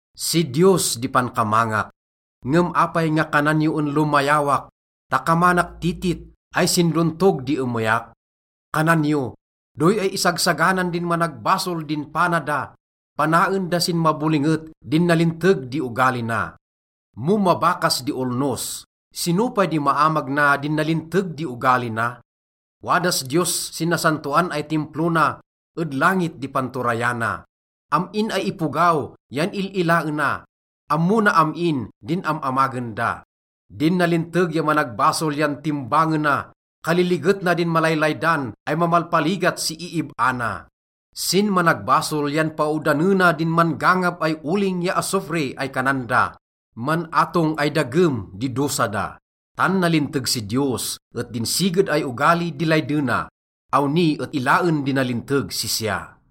Si Diyos di pankamangak. Ngem apay nga kanan yo en lomayawak ta kamanak titit ay sin dontog di emeyak? Kanan yo, “Doy ay isagsaganan din managbasol din pana da, panaen da sin mabolinget din nalinteg di ogali na. Mo mabakas di olnos, sino pay di maamag na din nalinteg di ogali na?” Wadas Diyos sin nasantoan ay Timplo na, ed langit di panturayana. Am-in ay ipogaw yan il-ilaena, ammo na am-in din am-amagen da. Din nalinteg ya managbasol yan timbangena, kaliliget na din malaylaydan ay mamalpaligat si iib-a na. Sin managbasol yan paodanena din man-gangab ay oling ya asufre ay kanan da. Man-atong ay dagem di dosa da. Tan nalinteg si Diyos et din siged ay ogali di laydena. Awni et ilaen di nalinteg sisya.